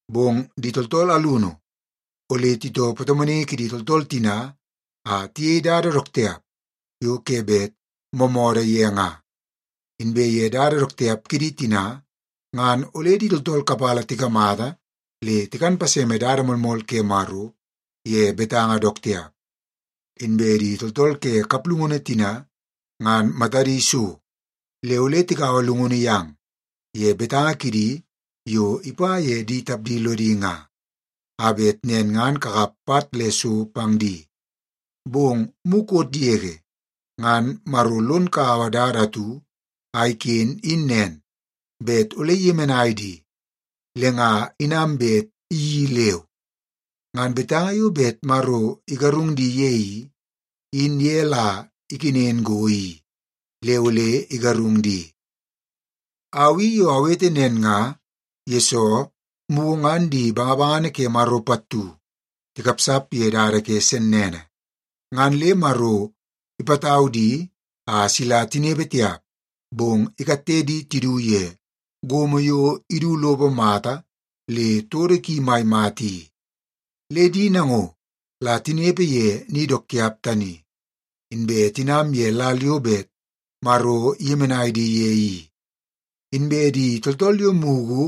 Bong di tooltool alunu ole titoo patomonaingi kidi tooltool tina a tiyei dada dook tiap yo ke bet moomoodoo ye nga. Inbe ye dada dook tiap kidi tina, ngan ole di tooltool kapala tikamata le tikan paseme dada moolmool ke Maro ye betanga dook tiap. Inbe di tooltool ke kaplungunu tina ngan matadi so, le ole tikaua llungunu yang ye betanga kidi yo ipa ye di tapdi lodi nga, a bet nen ngan kakap pat le so pang di. Bong mukot yege ngan Maro lon kaua dada atu a iken in nen, bet ole iyemenai di, le nga inam bet iyeii leu. Ngan betanga yo bet Maro igarung di ye i, in ye la ikenen go i le ole igarung di. Au i yo awete nen nga, yesoo mugu ngan di bangabangana ke Maro pattu tikapsap ye dada ke sennene, ngan le Maro ipatau di a sila tinepe tiap. Bong ikatte di tidu ye gomo yo idu lopo mata le todo ki mai mata i. Le di nango la tinepe ye ni dook tiap tani, inbe tinam ye lal yo bet Maro iyemenai di ye i. Inbe di tooltool yo mugu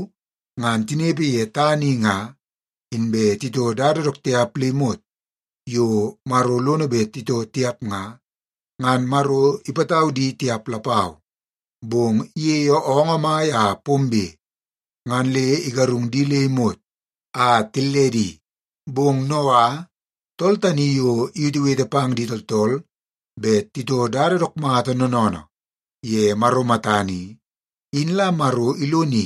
ngan tinepe ye tana i, inbe titoo dada dook tiap le imot yo Maro lono bet titoo tiap nga, ngan Maro ipatau di tiap lapau. Bong iyeie oongoo mai a pombe, ngan le igarung di le imot a tilledi. Bong Noa, tool tani yo iwetewete pang di tooltool bet titoo dada dook mata noonoonoo ye Maro matana i, in la Maro iloni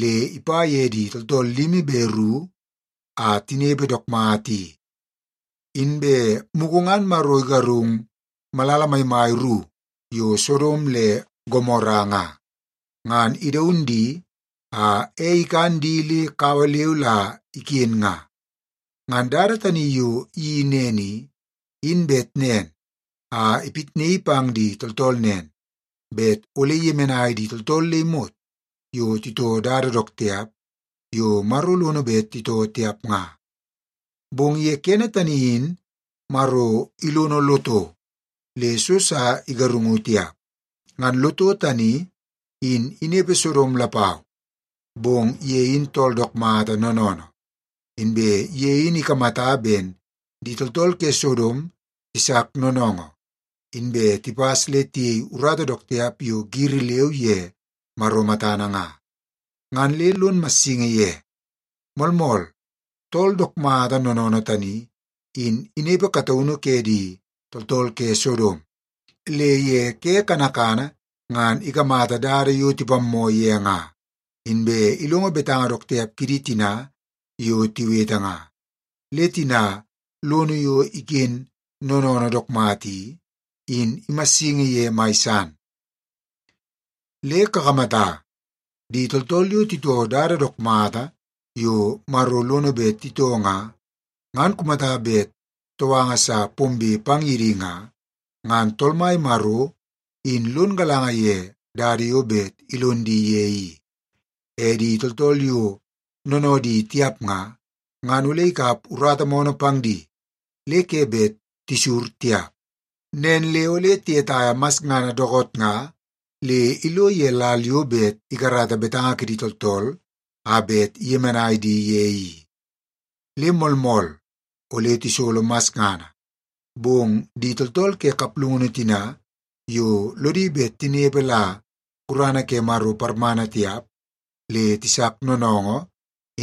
le ipa ye di tooltool limi be ru a tinepe dook mata i. Inbe mugu ngan Maro igarung malala maimai ru yo Sodom le Gomora nga, ngan idaun di a ei ikan di le kawa leu la iken nga. Ngan dada tani yo iyeii nen i, in bet nen a ipitnaii pang di tooltool nen, bet ole iyemenai di tooltool le imot yo titoo dada dook tiap yo Maro lono bet titoo tiap nga. Bong ye kene tani in Maro ilono Loto le so sa igarungu tiap. Ngan Loto tani in inepe Sodom lapau, bong ye in tool dook mata noonoonoo. Inbe ye in ikamata ben di tooltool ke Sodom tisak noonoongoo, inbe tipas le tiyei urata dook tiap yo giri leu ye Maro matana nga, ngan le lon massingi ye. Moolmool, tool dook mata noonoonoo tani, in inepe kataunu ke di tooltool ke Sodom, le ye ke kanakana ngan ikamata dada yo tipammoo ye nga, inbe ilongo betanga dook tiap kidi tina yo tiwete nga. Le tina lono yo iken noonoonoo dook mata i, in imassingi ye mai san. Le kakamata, di tooltool yo titoo dada dook mata yo Maro lono bet titoo nga, ngan kumata bet touanga sa pombe pang ye di nga, ngan Tool Mai Maro in lon galanga ye dada yo bet ilon di ye i. E di tooltool yo noonoodi tiap nga, ngan ole ikap urata moonoo pang di le ke bet tisur tiap. Nen le ole tiyetaia masngana dookoot nga le ilo ye lal yo bet ikarata betanga kidi tooltool a bet iyemenai di ye i. Le moolmool ole tisolo masngana, bong di tooltool ke kaplungunu tina yo lodi bet tinepe la gurana ke Maro parmana tiap le tisak noonoongoo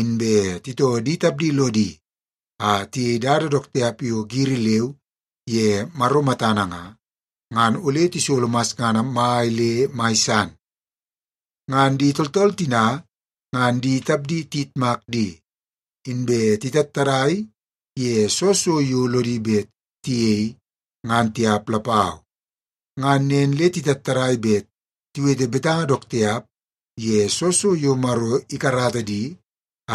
inbe titoo di tapdi lodi a tiyei dada dook tiap yo giri leu ye Maro matana nga, ngan ole tisolo masngana mai le mai san. Ngan di tooltool tina ngan di tapdi tiyitmak di, inbe titattadai ye soo so yo lodi bet tiyei ngan tiap lapau. Ngan nen le titattadai bet tiwete betanga dook tiap ye soo so yo Maro ikarata di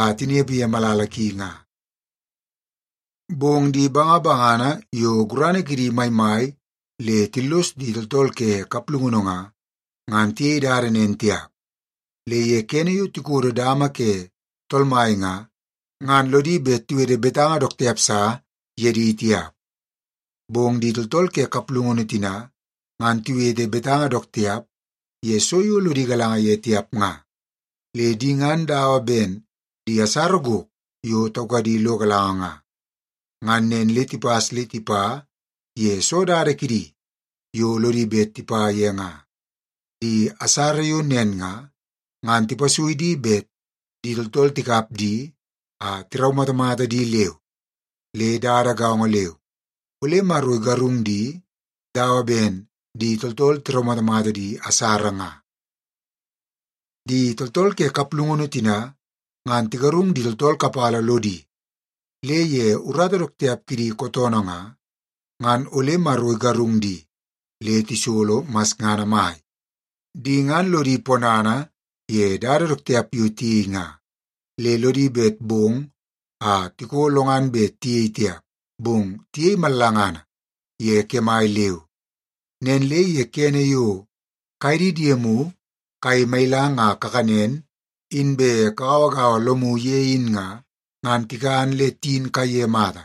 a tinepe ye malala ki nga. Bong di bangabangana yo gurana kidi maimai le tillos di tooltool ke kaplungunu nga, ngan tiyei dada nen tiap. Le ye kene yo tikodo dama ke Tool Mai nga, ngan lodi bet tiwete betanga dook tiap sa ye di tiap. Bong di tooltool ke kaplungunu tina, ngan tiwete betanga dook tiap ye so yo lodi galanga ye tiap nga. Le di ngan dawa ben di asara gok yo taukadi lo galanga nga. Ngan nen le tipas le tipa ye soo dada kidi yo lodi bet tipa ye nga. Di asara yo nen nga, ngan tipasui di bet di tooltool tikap di a tiraumatamata di leu. Le dada gaongo leu, ole Maro igarung di dawa ben di tooltool tiraumatamata di asara nga. Di tooltool ke kaplungunu tina ngan tigarung di tooltool kapala lodi, le ye urata dook tiap kidi kootoonoo nga, ngan ole Maro igarung di le tisolo masngana mai. Di ngan lodi ponana ye dada dook tiap yo tiyei nga, le lodi bet bong a tiko lo ngan bet tiyei tiap, bong tiyei mallangana ye kemai leu. Nen le ye kene yo kaye di diemu kayei mailang a kakanen inbe kagauagaua lomu ye in nga, ngan tikan le tiyin kaiye mata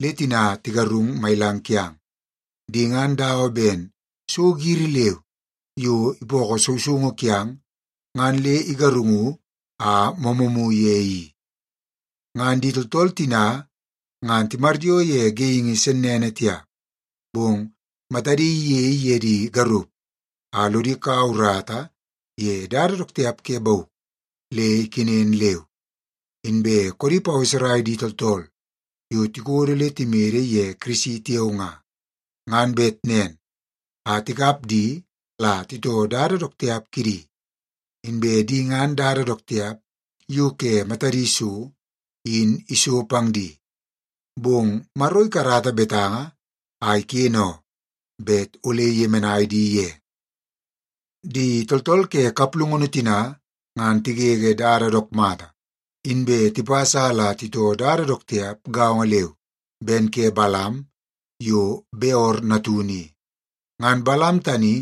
le tina tigarung mailang kiang. Di ngan dawa ben so giri leu yo ipookoo sousoungu kiang ngan le igarungu a moomoomu ye i. Ngan di tooltool tina ngan timaryoo ye geingi sennene tiap, bong matadi iyei ye di garup a lodi kaua urata ye dada dook tiap ke bauk le ikenen leu. Inbe koodi paweserai di tooltool yo tikodo le timede ye Kirisi tiao nga, ngan bet nen a tikap di la titoo dada dook tiap kidi. Inbe di ngan dada dook tiap yo ke matadi so in iso pang di. Bong Maro ikarata betanga a iken oo, bet ole iyemenai di ye. Di tooltool ke kaplungunu tina ngan tigege dada dook mata, inbe tipas a la titoo dada dook tiap gaongo leu ben ke Balam yo Beor natunu i. Ngan Balam tani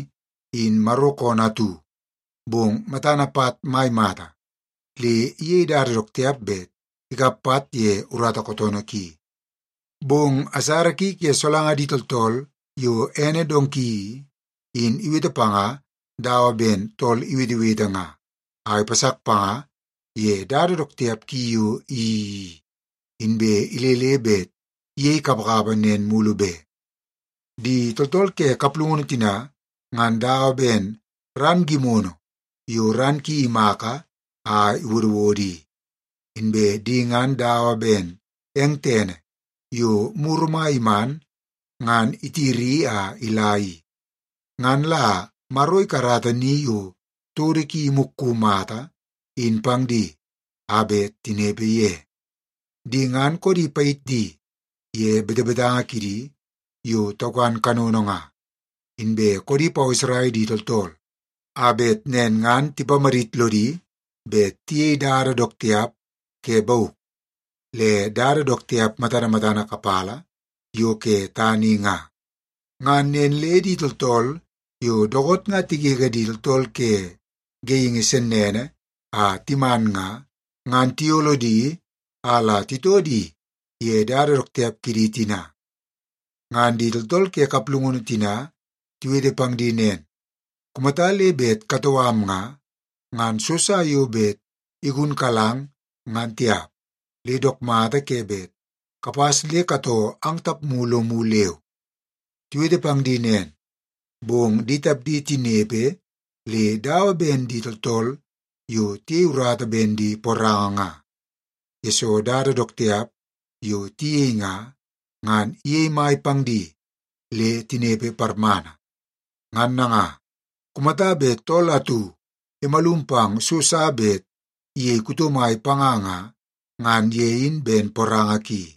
in Maro koonoo atu, bong matana pat mai mata, le iyei dada dook tiap bet ikap pat ye urata kootoonoo ki. Bong asara ki ke solanga di tooltool yo ene donki i, in iwete panga dawa ben tool iwetewete nga a ipasak panga ye dada dook tiap ki yo iyeii i, inbe ilele bet iyei kapakapa nen mulu be. Di tooltool ke kaplungunu tina ngan dawa ben ran gimono yo ran ki imaka a iwodowodo i. Inbe di ngan dawa ben eng tene yo muru mai iman ngan itiri a ila i. Ngan la Maro ikarata ni yo todo ki imukku mata in pang di a bet tinepe ye. Di ngan koodi payit di ye betebetanga kidi yo taukan kanono nga, inbe koodi paweserai di tooltool a bet nen ngan tipamadit lodi bet tiyei dada dook tiap ke bauk, le dada dook tiap matana matana kapala yo ke tana i nga. Ngan nen le di tooltool yo dookoot nga tigege di tooltool ke geingi sennene a timan nga, ngan tiyolo di a la titoo di ye dada dook tiap kidi tina. Ngan di tooltool ke kaplungunu tina tiwete pang di nen, “Kumata le bet katoo am nga, ngan so sa yo bet igunkalang ngan tiap, le dook mata ke bet kapas le katoo ang tapmu lomu leu.” Tiwete pang di nen, bong di tapdi tinepe le dawa ben di tooltool yo tiyei urata ben di poranga nga, yesoo dada dook tiap yo tiyei nga, ngan iyei mai pang di le tinepe parmana. Ngan nanga, kumata bet tool atu imalum pang so sa bet iyei kuto mai panga nga, ngan ye in ben poranga ki.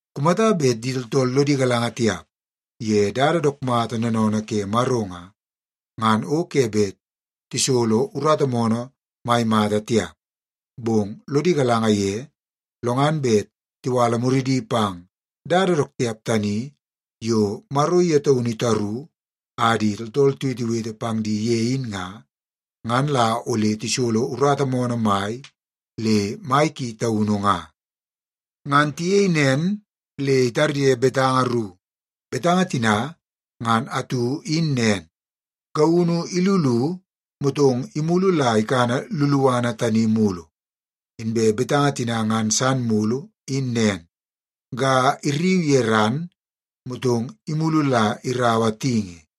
Kumata bet di tooltool lodi galanga tiap ye dada dook mata noonoonoo ke Maro nga, ngan o ke bet tisolo urata moonoo mai mata tiap. Bong lodi galanga ye, lo ngan bet tiwala muridi pang dada dook mata tani yo Maro ye taunu itaru a di tooltool tiwetewete pang di ye in nga, ngan la ole tisolo urata moonoo mai le mai ki taunu nga. Ngan tiyei nen le itarye betanga ru. Betanga tina ngan atu in nen, “Gaunu ilulu, motong imulu la ikana luluana tani mulu.” Inbe betanga tina ngan san mulu in nen, “Ga irriu ye ran, motong imulu la iraua tingi.”